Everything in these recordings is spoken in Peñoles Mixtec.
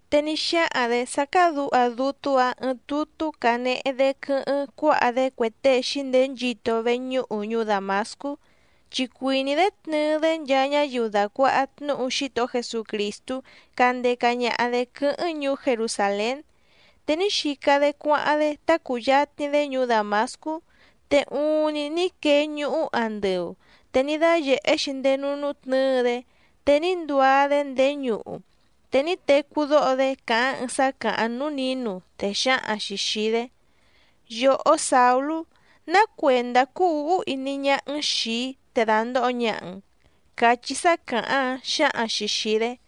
te ní xáhaⁿ‑dě sá cádǔha dútú‑ǎⁿ ɨɨⁿ tutú canehe‑dé quɨ́hɨ́ⁿ cuáha‑dé cue tée xǐndeé nchito veñúhu ñuú Dàmascú, chi cuìní‑dé tnɨɨ‑dé nchaa ñáyiu dàcuaha tnúhu Xítohó Jesucrìstú candeca ñaha‑dě quɨ́hɨ́ⁿ ñuú Jerusàlén. Te ní xica‑dé cuáháⁿ‑dé tá cùyatni‑dé ñuú Dàmascú, te uuⁿni ní quee ñuhú andɨu, te ní dáyèhé‑xi ndéé núú nútnɨ̌ɨ‑dé. Te ní nduá‑dé ndéé ñuhu, te ní tecú dóho‑dé càháⁿ ɨɨⁿ sá càháⁿ núú nǐnu, te xǎhaⁿ‑xi xìi‑dé: —Yòhó Sàulú, ¿ná cuèndá cúú ǔhú iní ñáhá‑n xìi‑í te dàndoho ñaha‑n? —cachí sá càháⁿ‑áⁿ xǎhaⁿ‑xi xìi‑dé.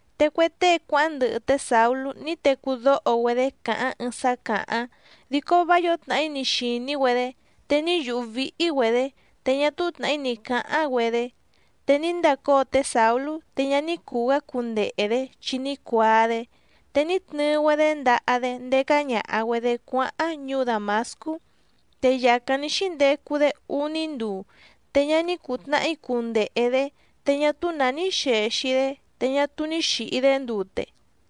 Te cue tée cuáháⁿ ndɨhɨ té Sàulú ní tecú dóho‑güedé càháⁿ ɨɨⁿ sá càháⁿ, dico vá yǒo tnàhí ni xìní‑güedé, te ní yùhú víhí‑güedě, te ñá túú tnàhí ni cǎháⁿ‑güedé. Te ní ndacóo té Sàulú, te ñá ní cùu‑gá cundehe‑dě, chi ní cuaa‑dé, te ní tnɨɨ‑güedé ndaha‑dé ndécá ñàha‑güedé cuáháⁿ ñuú Dàmascú. Te yàcáⁿ ní xíndecu‑dé úní nduu, te ñá ní cùu tnahí cundehe‑dě, te ñá túú nǎ ní xèxi‑dé, te ñá túú ní xìhi‑dé ndute.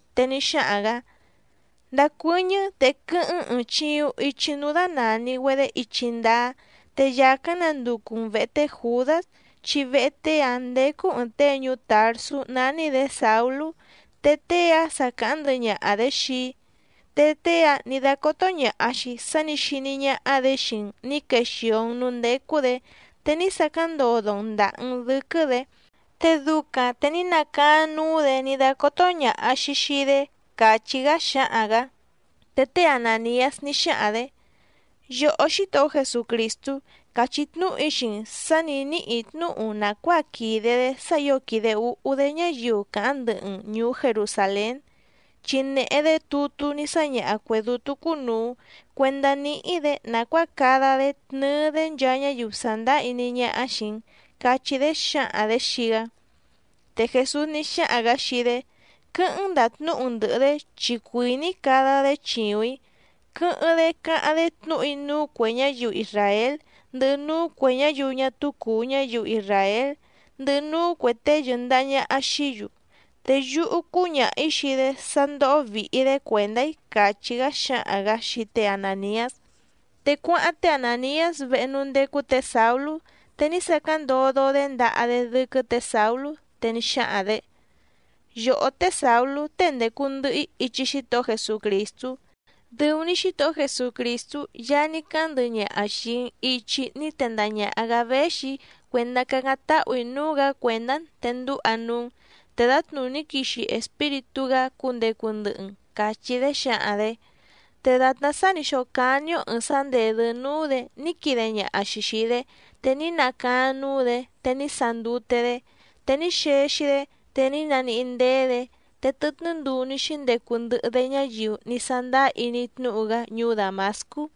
Te ní xáhaⁿ‑gǎ: —Ndacuɨ́ñɨ́, te quɨ́hɨ́ⁿ‑n ɨ̀ɨⁿ chiuⁿ ichi núú dánàni‑güedé Ichi Ndáá, te yàcáⁿ nanducu‑n vèhe té Jùdás, chi vehe tée‑áⁿ ndécú ɨ̀ɨⁿ tée ñuú Tàrsú nání‑dě Sàulú, te tée‑áⁿ sa càháⁿ ndɨhɨ ñaha‑dě xii‑í. Te tée‑áⁿ nǐ dácótó ñàha‑xi sá nǐ xiní ñáhá‑dě xii‑n nǐ quexìo‑n núú ndécú‑dě, te ní sacáⁿ ndodo‑n ndàha‑n dɨ́quɨ́‑dě, te ducaⁿ te ní nacaáⁿ núú‑dě ní dácótó ñàha‑xi xii‑dé —càchí‑gá xáhaⁿ‑gǎ. Te té Anàniás ní xáhaⁿ‑dě: —Yòhó Xítohó Jesucrìstú, càchí tnúhu‑í xii‑n sǎ nǐ níhì‑í tnúhu nàcuáa quìde‑dé sá ǐo quìde úhú‑dé ñáyiu càháⁿ ndɨhɨ‑n ñùú Jerusàlén. Chi nèhe‑dé tutú ní sáñaha cuè dútú cúnùu cuendá níhí‑dě nàcuáa cada‑dé tnɨɨ‑dé nchaa ñáyiu sàndáá iní ñáhá xìi‑n —cachí‑dé xǎhaⁿ‑dě xii‑gá. Te Jèsús ní xáhaⁿ‑gǎ xii‑dé: —Quɨ́hɨ́ⁿ‑n ndàtnúhu‑n ndɨ̀hɨ‑dé, chi cuìní‑í cada‑dé chìuⁿ‑í, quɨ́hɨ́ⁿ‑dé cáháⁿ‑dé tnúhu‑í núú cuè ñáyiu isràél, ndɨhɨ núú cuè ñáyiu ñá túú cùu ñáyiu isràél, ndɨhɨ núú cuè tée yɨ̀ndaha ñaha xií‑yu. Te yúhú cúñaha‑ǐ xii‑dé sá ndóhó vìhi‑dé cuèndá‑í —càchí‑gá xáhaⁿ‑gǎ xii té Anàniás. Te cuáháⁿ té Anàniás vehe núú ndécú tě Sàulú te ní sacáⁿ ndodo‑dé ndaha‑dé dɨ́quɨ́ tě Sàulú, te ní xáhaⁿ‑dě: —Yòhó té Sàulú tée ndècu ndɨhɨ‑í ichi Xítohó Jesucrìstú, dɨu‑ni Xítohó Jesucrìstú Yaá ní cáháⁿ ndɨhɨ ñaha xìi‑n ichi ní tendaha ñàha‑gá véxi‑í cuèndá cacáⁿ táhù‑í núú‑gǎ cuèndá‑n te ndúha núú‑n, te dǎtnùní quixi Espíritú‑gá cundecu ndɨhɨ‑n —càchí‑dé xǎhaⁿ‑dě. Te dàtná sá nǐ xócání‑ó ɨ̀ɨⁿ sá ndèdɨ́ núú‑dě ní quide ñaha‑xi xìi‑dé, te ní nacaáⁿ núú‑dě, te ní sandute‑dé. Te ní xexi‑dé, te ní naníhí ndéé‑dě, te tɨtnɨ́ nduu ní xíndecu ndɨhɨ‑dé ñáyiu ní sándáá iní tnúhu‑gá ñuú Dàmascú.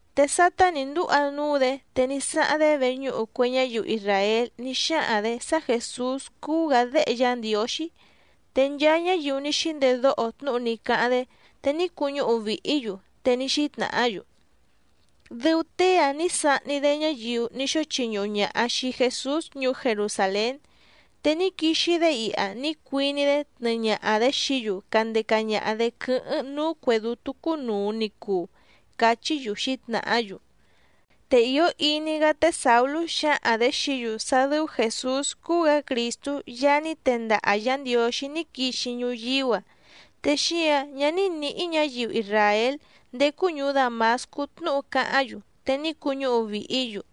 Te sátá nǐ ndúha núú‑dě, te ní sáháⁿ‑dé veñúhu cue ñáyiu isràél ní xáhaⁿ‑dě sá Jèsús cúú‑gǎ Déhe Yá Ndiǒxí. Te nchaa ñáyiu ní xíndedóho tnúhu ní cáháⁿ‑dé, te ní cuñúhu vìhí‑yu, te ní xítnàhá‑yu: —Dɨu tée‑ǎⁿ ní sahni‑dé ñáyiu ní xóo chiñuhu ñaha xìi Jesús ñuú Jerusàlén. Te ní quixi‑dé iha ní cuiní‑dé tnɨɨ ñaha‑dě xií‑yu candeca ñaha‑dě quɨ́hɨ́ⁿ núú cuè dútú cúnùu ni cuu —cachí‑yu xǐtnàhá‑yu. Te ìó iní‑gá té Sàulú xǎhaⁿ‑dě xií‑yu sá dɨ́ú Jèsús cúú‑gǎ Crìstú Yaá ní tendaha Yǎ Ndiǒxí ní quixi ñuyíú‑a, te xíǎⁿ ñá ní nǐhí ñǎyiu isràél ndécú ñùú Dàmascú tnúhu cáháⁿ‑yu, te ní cuñúhu vìhí‑yu.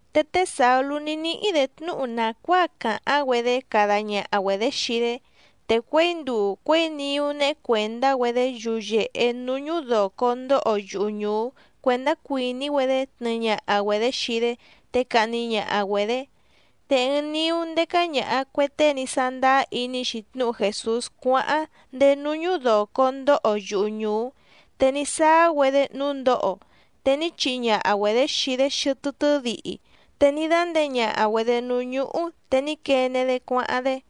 Te té Sàulú ní níhí‑dě tnúhu nàcuáa càháⁿ‑güedé cada ñaha‑güedě xii‑dé, te cuěi nduu cuěi niú néhé cuèndá‑güedé yuyèhe núú ñúdòco ndóho yuhu ñùú cuèndá cuìní‑güedé tnɨɨ ñaha‑güedě xii‑dé te cahni ñaha‑güedě. Te ɨɨⁿ niú ndécá ñàha cue tée ní sándáá iní‑xi tnúhu Jèsús cuáháⁿ ndéé núú ñúdòco ndóho yuhu ñùú. Te ní sáá‑güedé núú ndǒho, te ní chihi ñaha‑güedě xii‑dé xɨtɨ́ tɨ́dihi te ní dánděe ñaha‑güedě núú ñúhú, te ní quene‑dé cuáháⁿ‑dé.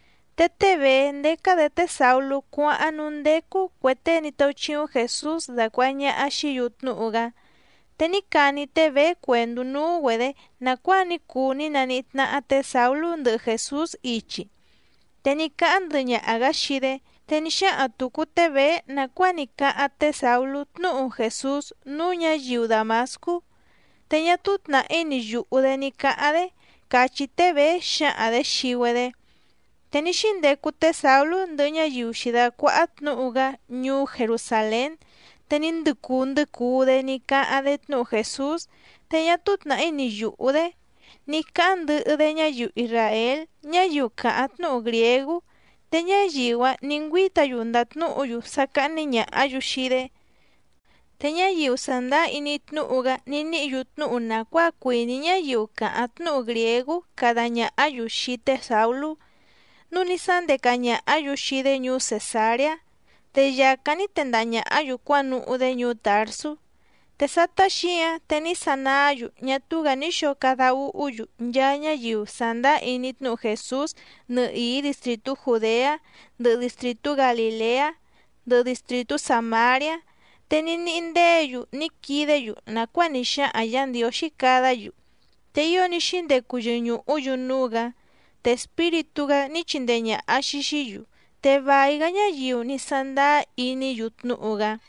Te té Bèé ndécá‑dě té Sàulú cuáháⁿ núú ndécú cuè tée ní táúchíúⁿ Jèsús dacuàha ñaha xií‑yu tnúhu‑gá. Te ní cani té Bèé cuèndú núú‑güedě nàcuáa ní cuu ní naníhí tnáhá tě Sàulú ndɨhɨ Jèsús ichi, te ní cáháⁿ ndɨhɨ ñaha‑gǎ xii‑dé. Te ní xáhaⁿ tùcu té Bèé nàcuáa ní cáháⁿ té Sàulú tnúhu Jèsús núú ñǎyiu Dàmascú, te ñá túú tnàhí ni yùhú‑dé ní cáháⁿ‑dé, càchí té Bèé xǎhaⁿ‑dě xii‑güedé. Te ní xíndecu té Sàulú ndɨhɨ ñáyiu xǐdácuáhá tnǔhu‑gá ñuú Jerusàlén. Te ní ndɨcuu ndɨcuu‑dé ní cáháⁿ‑dé tnúhu Jèsús, te ñá túú tnàhí ni yùhú‑dé ní cáháⁿ ndɨhɨ‑dé ñáyiu isràél ñáyiu càháⁿ tnúhu grìégú. Te ñáyiu‑áⁿ nǐ ngüíta‑yu ndàtnúhu‑yu sá cáhní ñàhá‑yu xii‑dé. Te ñáyiu sàndáá iní tnúhu‑gá ní níhǐ‑yu tnúhu nàcuáa cuìní ñáyiu càháⁿ tnúhu grìégú cada ñàhá‑yu xii té Sàulú, núu ní sándeca ñàhá‑yu xii‑dé ñuú Cèsareá, te yàcáⁿ ní tendaha ñàhá‑yu cuánuhú‑dé ñuú Tàrsú. Te sátá xǐáⁿ te ní sanaá‑yu ñá túú‑gǎ ní xǒo cada úhú‑yu nchaa ñáyiu sàndáá iní tnúhu Jèsús nɨhìí distrìtú Jùdeá, ndɨhɨ distrìtú Galìleá, ndɨhɨ distrìtú Sàmariá. Te ní níhí ndéě‑yu ní quidé‑yu nàcuáa ní xáhaⁿ Yǎ Ndiǒxí cadá‑yu, te ío ní xíndecu yɨñùhú‑yu núú‑gǎ, te Espíritú‑gá ní chindee ñàha‑xi xií‑yu, te vài‑gá ñáyiu ní sándáá iní‑yu tnúhu‑gá.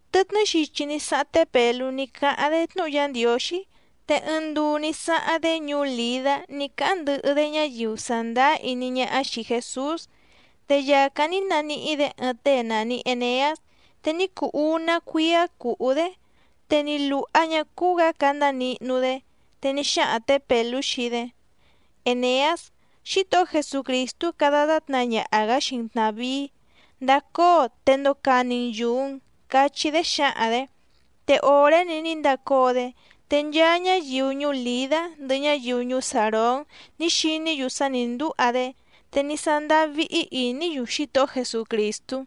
Tɨtnɨ́ xichi ní sáháⁿ té Pèlú ní cáháⁿ‑dé tnúhu Yá Ndiǒxí. Te ɨɨⁿ nduu ní sáháⁿ‑dé ñuú Lìdá ní cáháⁿ ndɨhɨ‑dé ñáyiu sàndáá iní ñáhá xìi Jesús. Te yàcáⁿ ní naníhí‑dě ɨɨⁿ tée nàni Eneás, te ní cuu úná cuíá cùhú‑dé, te ni lùha ñá cúú‑gǎ candá nihnu‑dé. Te ní xáhaⁿ tě Pèlú xii‑dé: —Èneás, Xítohó Jesucrìstú cada tátna ñaha‑gǎ xii‑n tnàvíí. Ndacóo te ndocani‑n yùu‑n —cachí‑dé xǎhaⁿ‑dě. Te òré‑ni ní ndacóo‑dé. Te nchaa ñáyiu ñuú Lìdá ndɨhɨ ñáyiu ñuú Sàrón ní xiní‑yu sá nǐ ndúha‑dé, te ní sándáá víhí ìní‑yu Xítohó Jesucrìstú.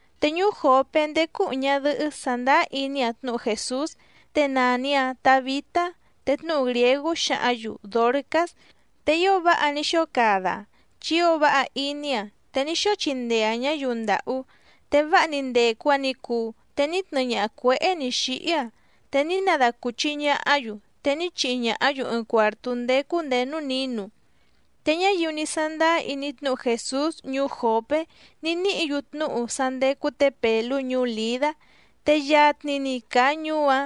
Te ñuú Jòpé ndécú ɨ̀ɨⁿ ñadɨhɨ́ sàndáá iní‑aⁿ tnúhu Jèsús, te nàni‑aⁿ Tabitá, te tnúhu grìégú xǎhǎⁿ‑yu Dòrcás, te ío váha ní xóo cada‑aⁿ chi ío váha iní‑aⁿ, te ní xóo chindee‑aⁿ ñǎyiu ndàhú. Te váha‑ni ndècu‑aⁿ ni cuu, te ní tnɨɨ ñaha cuěhé nǐ xíhí‑aⁿ, te ní nadacùchi ñahá‑yu, te ní chihi ñàhá‑yu ɨɨⁿ cuàrtú ndécú nděé núú nǐnu. Te ñáyiu ní sándáá iní tnúhu Jèsús ñuú Jòpé ní níhǐ‑yu tnúhu sá ndécú tě Pèlú ñuú Lìdá. Te yatni‑ni càa ñuú‑áⁿ,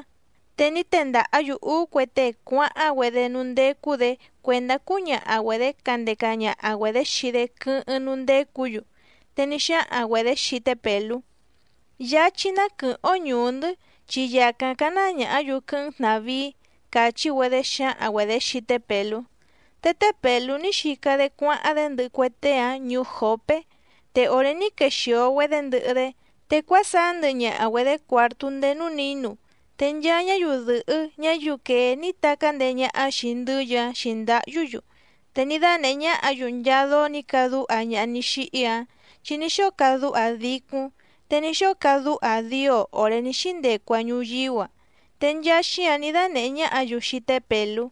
te ní tendàhá‑yu úú cue tée cuáháⁿ‑güedé núú ndécú‑dě cuèndá cúñaha‑güedě candeca ñaha‑güedě xii‑dé quɨ́hɨ́ⁿ núú ndécǔ‑yu. Te ní xáhaⁿ‑güedě xii té Pèlú: —Yáchí ná quɨ̀hɨ́ⁿ‑ó ñùú‑ndɨ́, chi yàcáⁿ cáná ñàhá‑yu quɨ́hɨ́ⁿ‑n tnàvíí —càchí‑güedé xǎhaⁿ‑güedě xii té Pèlú. Te té Pèlú ní xica‑dé cuáháⁿ‑dé ndɨhɨ cue tée‑áⁿ ñuú Jòpé, te òré ní quexìo‑güedé ndɨhɨ‑dé, te cuásaá ndɨhɨ ñaha‑güedě cuàrtú ndéé núú nǐnu. Te nchaa ñáyiu dɨ̀hɨ́ ñáyiu quèé ní tacá ndèé ñáhá xìi ndɨ́yɨ‑áⁿ xǐndáhyú‑yu, te ní dánèhé ñáhǎ‑yu nchaa dóó nǐ cadúha ñaha ní xíhí‑áⁿ. Chi ní xóo cadúha‑aⁿ dícúⁿ, te ní xóo cadúha‑aⁿ dío òré ní xíndecu‑aⁿ ñuyíú‑a, te nchaa xíǎⁿ ní dánèhé ñáhǎ‑yu xii té Pèlú.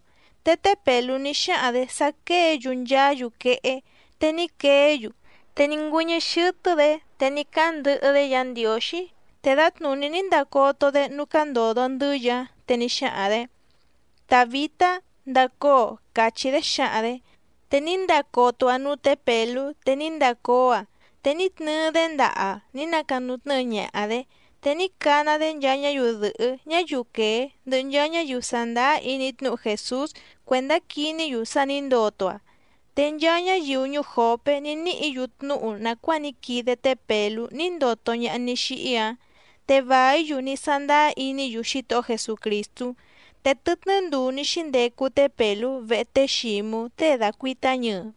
Te té Pèlú ní xáhaⁿ‑dě sá quéě‑yu nchaá‑yu quehé, te ní queé‑yu. Te ní ngüɨ́ñɨ́ xɨ́tɨ́‑dě te ní cáháⁿ ndɨhɨ‑dé Yǎ Ndiǒxí, te dǎtnùní ní ndacoto‑dé núú cándòdo ndɨ́yɨ‑áⁿ, te ní xáhaⁿ‑dě: —Tàbitá, ndacóo —càchí‑dé xǎhaⁿ‑dě. Te ní ndacoto‑aⁿ núú tě Pèlú te ní ndacóo‑aⁿ. Te ní tnɨɨ‑dé ndaha‑aⁿ ní nacanutnɨ́ɨ ñaha‑dě. Te ní cana‑dé nchaa ñáyiu dɨ̀hɨ́ ñáyiu quèé ndɨhɨ nchaa ñáyiu sàndáá iní tnúhu Jèsús cuèndá quiní‑yu sá nǐ ndoto‑aⁿ. Te nchaa ñáyiu ñuú Jòpé ní níhǐ‑yu tnúhu nàcuáa ní quide té Pèlú ní ndoto ñaha ní xíhí‑áⁿ, te vàí‑yu ní sándáá iní‑yu Xítohó Jesucrìstú. Te tɨtnɨ́ nduu ní xíndecu té Pèlú vehe té Xǐmú tée dàcuitá ñɨɨ.